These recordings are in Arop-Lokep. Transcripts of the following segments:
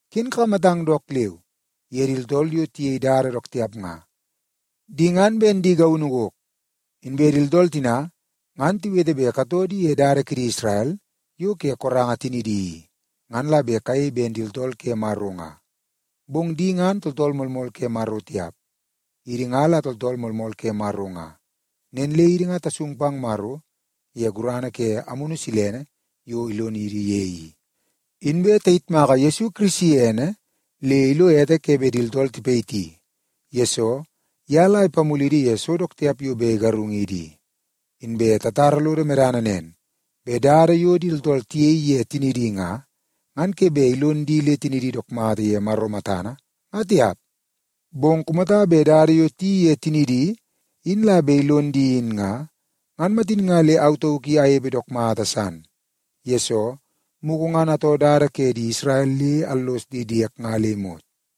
Ken kakamatang dook leu ye di tooltool yo tiyei dada dook tiap nga. Di ngan ben di gaunu gok. Inbe di tooltool tina ngan tiwete bet katoo di ye dada kidi Isrel yo ke koranga tinidi i, ngan la bet kayei ben di tooltool ke Maro nga. Bong di ngan tooltool moolmool ke Maro tiap. Idi nga la tooltool moolmool ke Maro nga. Nen le idi nga tasung pang Maro ye gurana ke Amunu Silene yo ilonidi ye i. Inbe tayitmaka Yesu Kirisi ene le ilo ete ke bet di tooltool tipayiti, yesoo ye la ipamulidi ye so dook tiap yo bet igarungidi i. Inbe tatara lodo medana nen, bet dada yo di tooltool tiyei ye tinidi nga, ngan ke bet ilonidi le tiniidi dook mata ye Maro matana, nga tiap. Bong kumata bet dada yo tiyeii ye tinidi in la bet ilon di in nga, ngan matin nga le au tauk i anepe dook mata san, yesoo mugu ngan atoo dada ke di Isrel le allos di diek nga le imot.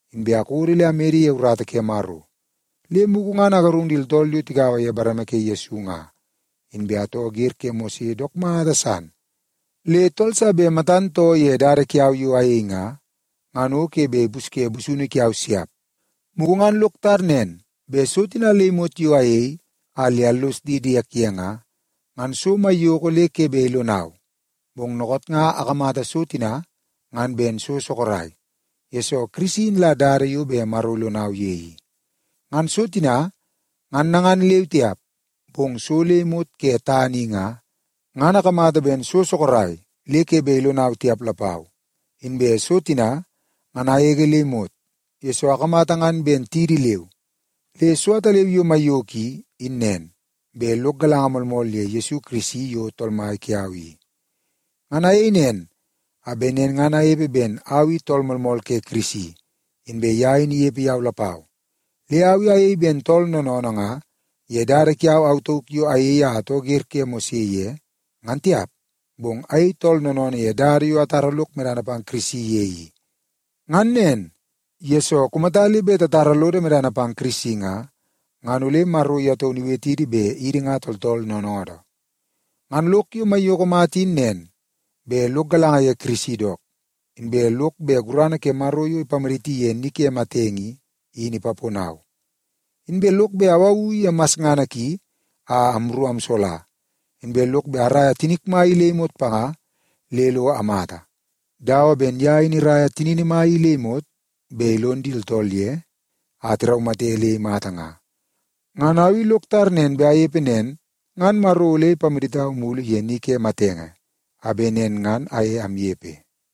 Inbe akodo le amede ye urata ke Maro, le mugu ngan agarung di tooltool yo tigaua ye bareme ke Yesu nga. Inbe atoo wer ke Mose dook mata san, le tool sa bet matan too ye dada kiau yo ayei nga, ngan o ke bet ipusye busunu kiau siap. Mugu ngan lok tar nen bet so tina le imot yo ayei a le allos di diek ye nga, ngan so maiyoko le ke bet ilonau. Bong dookoot nga akamata so tina ngan ben so sorok, yesoo Kirisi in la dada yo bet Maro ilonau ye i. Ngan so tina ngan nangan leu tiap, bong so le imot ke tana i nga, ngan akamata ben so sorok le ke bet ilonau tiap lapau. Inbe so tina ngan agege le imot, yesoo akamata ngan ben tidi leu. Le so ataleu yo maiyoko i, in nen, bet lok galanga moolmool ye Yesu Kirisi yo Tool Mai kiau i. Ngan ayei nen a bet nen ngan anepe ben au i tool moolmool ke Kirisi, inbe ye in inepe yau lapau. Le au i ayei ben tool noonoonoo nga ye dada kiau au tauk yo ayei a atoo wer ke Mose ye, ngan tiap. Bong ayei tool noonoonoo ye dada yo atara lok medana pang Kirisi ye i. Ngan nen, yesoo kumata le bet tatara lodo medana pang Kirisi nga, ngan ole Maro ye taunu iwetidi bet idi nga tooltool noonoodoo. Ngan lok yo maiyoko mata in nen, bet lok galanga ye Kirisi dook. Inbe lok bet gurana ke Maro yo ipamaditi ye ni ke matenge i, in ipaponau. Inbe lok bet awawu ye masngana ki a amru amsola. Inbe lok bet araia tinik mai i le imot panga le lo amata, dawa ben ye in iraia tinini mai i le imot bet ilon di tooltool ye, a tiraumate le imata nga. Ngan au lok tar nen bet anepe nen, ngan Maro ole ipamaditau mulu ye ni ke matenge a bet nen ngan aye amnepe.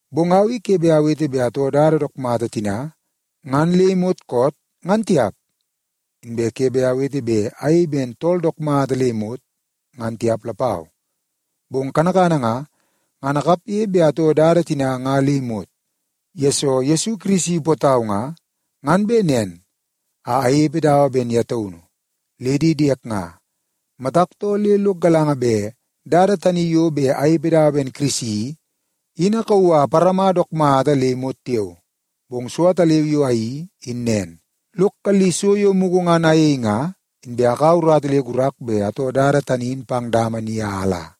Bong au i ke bet awete bet atoo dada dook mata tina ngan le imot koot, ngan tiap. Inbe ke bet awete bet ayei ben tool dook mata le imot, ngan tiap lapau. Bong kanakana nga, ngan akapge bet atoo dada tina nga le imot, yesoo Yesu Kirisi ipootau nga, ngan bet nen a anepe dawa ben ye taunu. Le di diek nga, matak too le lok galanga bet dada tani yo bet anepe dawa ben Kirisi i, in akauu a aparama dook mata le imot tiao. Bong so ataleu yo ayeii, in nen; lok kalli so yo mugu ngan ayei nga, inbe akaua urata le gurak bet atoo dada tani in pang dama ni a ala.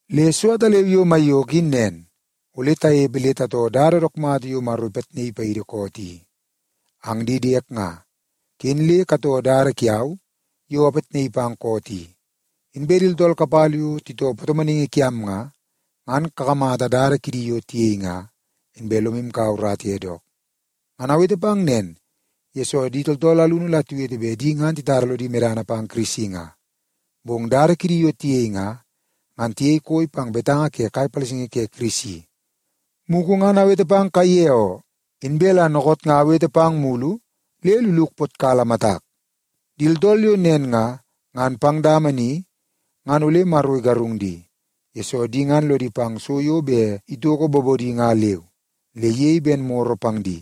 Le so ataleu yo maiyoko in nen, ole tanepe le tatoo dada dook mata yo Maro ipitnaii paidi koot i. Ang di diek nga, ken le katoo dada kiau yo apitnaii pang koot i. Inbe di tooltool kapala yo titoo patomonaingi kiam nga, ngan kakamata dada kidi yo tiyei nga, inbe lomu kaua urata ye dook. Ngan awete pang nen, yesoo di tooltool alunu la tiwete bet di ngan titara lodi medana pang Kirisi nga, bong dada kidi yo tiyei nga, ngan tiyei koi pang betanga ke kai palasingi ke Kirisi. Mugu ngan awete pang kaiye oo, inbe la dookoot nga awete pang mulu le luluk ipotkala matak. Di tooltool yo nen nga, ngan pang dama ni ngan ole Maro igarung di, yesoo di ngan lodi pang so yo bet itoko bobodi nga leu, le iyei ben maro pang di.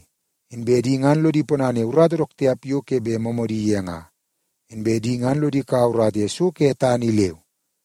Inbe di ngan lodi ponana ye urata dook tiap yo ke bet moomoodi ye nga. Inbe di ngan lodi kaua urata ye so ke tana i leu.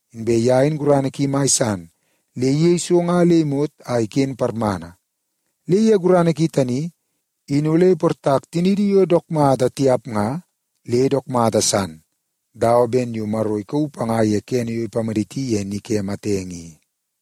Inbe ye in gurana ki mai san le iyei so nga le imot a iken parmana. Le ye gurana ki tani, in ole iportak tiniidi yo dook mata tiap nga, le dook mata san dawa ben yo Maro ikauu panga ye kene yo ipamaditi ye ni ke matenge i.